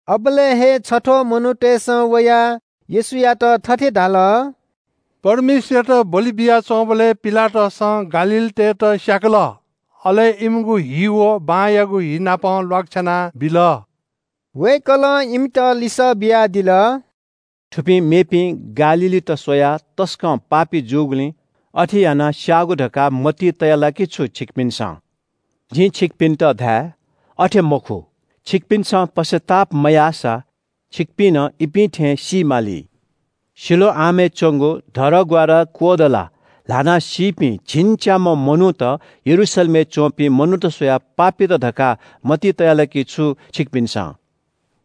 अबलय् हे छथ्‍वः मनूतय्‌सं वयाः येशूयात थथे धाल – “परमेश्‍वरयात बलि बियाच्‍वंबलय् पिलातसं गालीलीतय्‌त स्‍याकल। अले इमिगु हि व बांयागु हि नाप ल्‍वाकछ्याना बिल।” वय्‌कलं इमित लिसः बियादिल – “थुपिं मेपिं गालीलीत स्‍वयाः तसकं पापी जूगुलिं अथे यानाः स्‍याःगु धकाः मतिइ तया ला कि छु छिकपिन्‍सं? जिं छिकपिन्‍त धाये – अथे मखु, छिकपिन्‍सं पश्‍चाताप मयाःसा छिकपिं नं इपिं थें सी माली। सिलोआमय् च्‍वंगु धरहरा क्‍वःदलाः ल्‍हानाः सीपिं झिंच्‍याम्‍ह मनूत यरूशलेमय् च्‍वंपिं मनूत स्‍वयाः पापीत धकाः मतिइ तया ला कि छु छिकपिन्‍सं?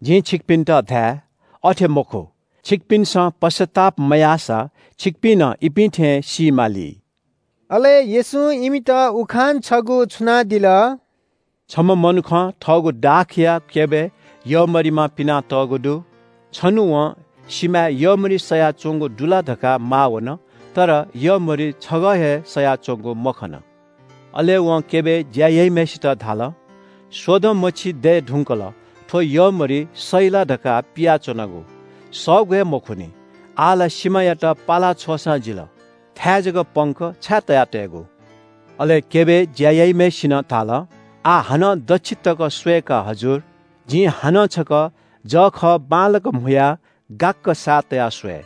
जिं छिकपिन्‍त धाये – अथे मखु, छिकपिन्‍सं पश्‍चाताप मयाःसा छिकपिं नं इपिं थें सी माली।” अले येशूं इमित उखान छगू छुनादिल – “छम्‍ह मनुखं थःगु दाखया क्‍यबय् यःमरिमा पिनातःगु दु। छन्‍हु वं सिमाय् यःमरि सयाच्‍वंगु दु ला धकाः माः वन, तर यःमरि छगः हे सयाच्‍वंगु मखन। अले वं क्‍यबय् ज्‍या याइम्‍हय्‌सित धाल – ‘स्‍वदँ मछि दये धुंकल थ्‍व यःमरि सइ ला धकाः पियाच्‍वनागु, सःगु हे मखुनि। आः ला सिमायात पाला छ्वःसां जिल। थाय् जक पंक, छाय् तया तयेगु?’ “अले क्‍यबय् ज्‍या याइम्‍हय्‌सिनं धाल – ‘आः हानं दच्‍छि तक स्‍वये का हजुर। जिं हानं छकः जःखः बांलाक म्‍हुयाः गाक्‍क साः तयाः स्‍वये।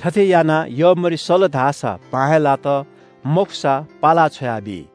थथे यानाः यःमरि सल धाःसा बां हे लात, मखुसा पाला छ्वयाबी।’”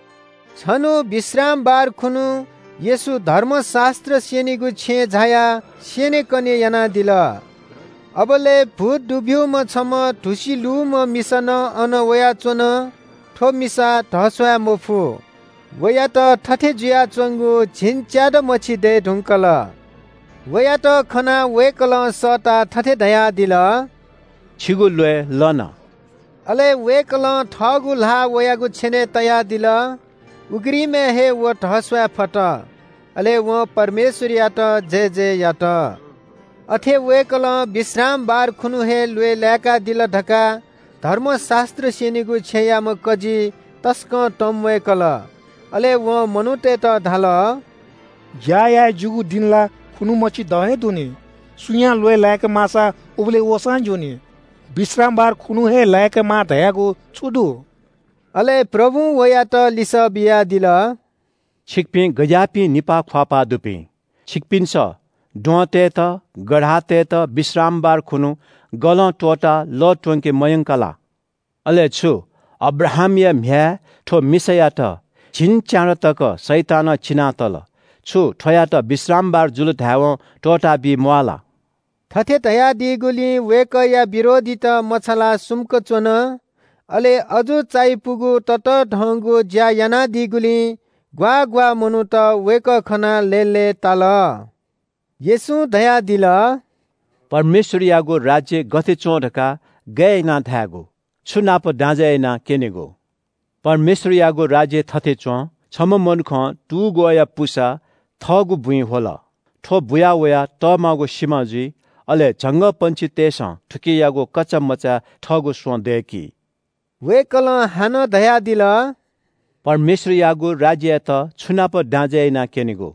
छन्‍हु विश्रामबार खुन्‍हु येशू धर्मशास्‍त्र स्‍यनीगु छेँय् झायाः स्‍यनेकने यानादिल। अबलय् भूत दुब्‍यूम्‍ह छम्‍ह धुसि लूम्‍ह मिसा नं अन वयाच्‍वन। थ्‍व मिसा धस्‍वाये मफु। वयात थथे जुयाच्‍वंगु झिंच्‍यादँ मछि दये धुंकल। वयात खनाः वय्‌कलं सःताः थथे धयादिल – “छिगु ल्‍वय् लन।” अले वय्‌कलं थःगु ल्‍हाः वयागु छेनय् तयादिल। उघ्रिमय् हे व धस्‍वाये फत। अले वं परमेश्‍वरयात जयजय यात। अथे वय्‌कलं विश्रामबार खुन्‍हु हे ल्‍वय् लाय्‌कादिल धकाः धर्मशास्‍त्र स्‍यनीगु छेँयाम्‍ह कजी तसकं तंम्‍वय्‌कल। अले वं मनूतय्‌त धाल – “ज्‍या याये ज्‍यूगु दिं ला खुन्‍हु मछि द हे दु नि। सुयां ल्‍वय् लाय्‌के माःसा उबलय् वःसां ज्‍यूनि। विश्रामबार खुन्‍हु हे लाय्‌केमाः धयागु छु दु?” अले प्रभुं वयात लिसः बियादिल – “छिकपिं गज्‍याःपिं निपाः ख्‍वाःपाः दुपिं? छिकपिन्‍सं द्वहंतय्‌त, गधातय्‌त विश्रामबार खुन्‍हु गलं त्‍वःताः लः त्‍वंके मयंका ला? अले छु, अब्राहामया म्‍ह्याय् थ्‍व मिसायात झिंच्‍यादँ तक शैतानं चिनातल। छु थ्‍वयात विश्रामबार जुल धायेवं त्‍वःताबी म्‍वाः ला?” थथे धयादीगुलिं वय्‌कःया विरोधीत मछालाः सुम्‍क च्‍वन। अले अजू चायापुगु ततःधंगु ज्‍या यानादीगुलिं ग्‍वाः ग्‍वाः मनूत वय्‌कः खनाः लय्‌लय्‌ताल। येशूं धयादिल – “परमेश्‍वरयागु राज्‍य गथे च्‍वं धकाः गय् यानाः धायेगु? छु नाप दाँजय् यानाः क्‍यनेगु? परमेश्‍वरयागु राज्‍य थथे च्‍वं। छम्‍ह मनुखं तुग्‍वःया पुसा थःगु बुँइ ह्वल। थ्‍व बुया वयाः तःमागु सिमा जुइ, अले झंगःपंक्षीतय्‌सं थुकियागु कचामचाय् थःगु स्‍वँ दय्‌की।” वय्‌कलं हानं धयादिल – “परमेश्‍वरयागु राज्‍ययात छु नाप दाँजय् यानाः क्‍यनेगु?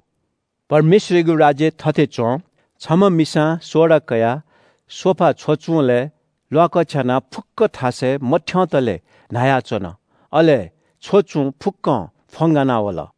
परमेश्‍वरयागु राज्‍य थथे च्‍वं। छम्‍ह मिसां सोडा कयाः सोफा छ्वचुंलय् ल्‍वाकछ्यानाः फुक्‍क थासय् मथ्‍यंतले न्‍हायाच्‍वन। अले छ्वचुं फुक्‍कं फ्‍वंगाना वल।”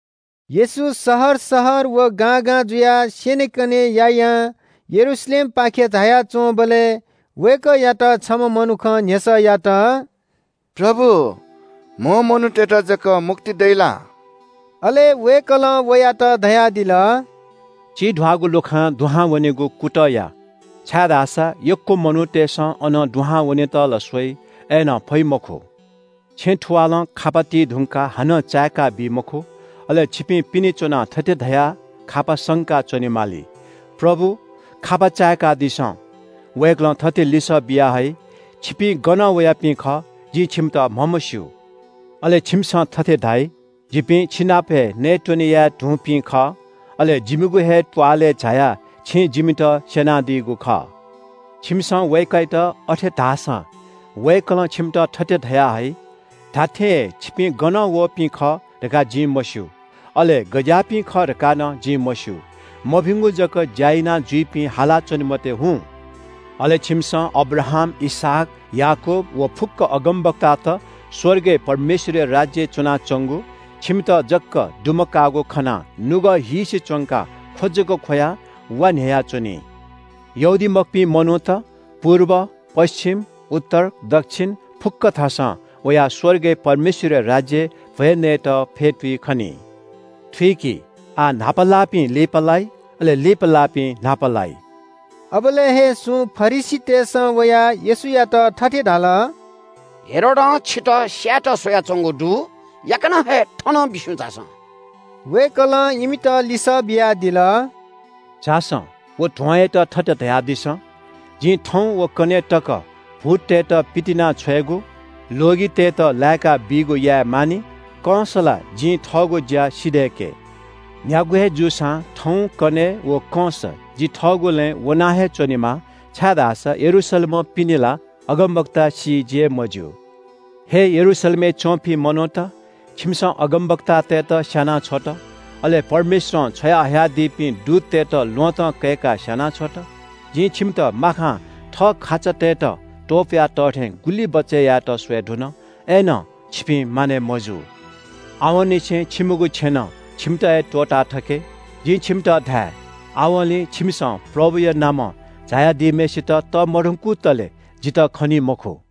येशू शहर शहर व गां गां जुयाः स्‍यनेकने यायां यरूशलेमपाखे झाया च्‍वंबलय् वय्‌कःयात छम्‍ह मनुखं न्‍ह्यसः यात – “प्रभु, कम मनूतय्‌त जक मुक्ति दइ ला?” अले वय्‌कलं वयात धयादिल – “चिब्‍यागु लुखां दुहां वनेगु कुतः या, छाय्‌धाःसा यक्‍व मनूतय्‌सं अनं दुहां वनेत ला स्‍वइ, अय्‌नं फइ मखु। छेँ थुवालं खापा ति धुंकाः हानं चाय्‌काबी मखु। अले छिपिं पिने च्‍वनाः थथे धयाः खापा संका च्‍वनेमाली – ‘प्रभु, खापा चाय्‌कादिसँ।’ वय्‌कलं थथे लिसः बिया हइ – ‘छिपिं गनं वयापिं खः? जिं छिमित म्‍हमस्‍यू।’ अले छिमिसं थथे धाइ – ‘जिपिं छिनाप हे नयेत्‍वने याये धुंपिं खः। अले जिमिगु हे त्‍वालय् झायाः छिं जिमित स्‍यनादीगु खः।’ छिमिसं वय्‌कःयात अथे धाःसां वय्‌कलं छिमित थथे धया हइ – ‘धात्‍थें हे छिपिं गनं वःपिं खः धकाः जिं मस्‍यू। अले गज्‍याःपिं खः धकाः नं जिं मस्‍यू। मभिंगु जक ज्‍या यानाजुइपिं, हालाच्‍वने मते, हुँ।’ “अले छिमिसं अब्राहाम, इसहाक, याकूब व फुक्‍क अगमवक्तात स्‍वर्गय् परमेश्‍वरया राज्‍यय् च्‍वनाच्‍वंगु, छिमित जक दुमकाःगु खनाः नुगः हीसे च्‍वंकाः ख्‍व जक ख्‍वयाः, वा न्‍ह्ययाच्‍वनी। यहूदीमखुपिं मनूत पुर्ब, पच्‍छिम, उत्तर, दच्‍छिन फुक्‍क थासं वयाः स्‍वर्गय् परमेश्‍वरया राज्‍यय् भ्‍वय् नयेत फ्‍यतुइ खनी। थुइकि, आः न्‍हापा लाःपिं लिपालाइ, अले लिपा लाःपिं न्‍हापा लाइ।” अबलय् हे सुं फरिसीतय्‌सं वयाः येशूयात थथे धाल – “हेरोदं छितः स्‍यायेत स्‍वयाच्‍वंगु दु, याकनं हे थनं बिस्‍युं झासँ।” वय्‌कलं इमित लिसः बियादिल – “झासँ व ध्‍वंयात थथे धयादिसँ – जिं थौं व कन्‍हय्‌ तक भूततय्‌त पितिनाछ्वयेगु, ल्‍वगितय्‌त लाय्‌काबीगु याये मानि, कंस ला जिं थःगु ज्‍या सिधय्‌के। न्‍ह्यागु हे जूसां थौं, कन्‍हय् व कंस जि थःगु लँय् वना हे च्‍वनेमाः छाय्‌धाःसा यरूशलेमं पिने ला अगमवक्ता सी जि हे मज्‍यू।” “हे यरूशलेमय् च्‍वंपिं मनूत, छिमिसं अगमवक्तातय्‌त स्‍याना छ्वत, अले परमेश्‍वरं छ्वयाहयादीपिं दूततय्‌त ल्‍वहँतं कय्‌काः स्‍याना छ्वत। जिं छिमित माखां थः खाचातय्‌त त्‍वपुया तः थें गुलि बचय् यायेत स्‍वये धुन। अय्‌नं छिपिं मानय् मजू। आवंनिसें छिमिगु छेँनं छिमित हे त्‍वःताथके। जिं छिमित धाये – आवंलि छिमिसं प्रभुया नामं झायादीम्‍हय्‌सित तःमधंकुतले जितः खनी मखु।”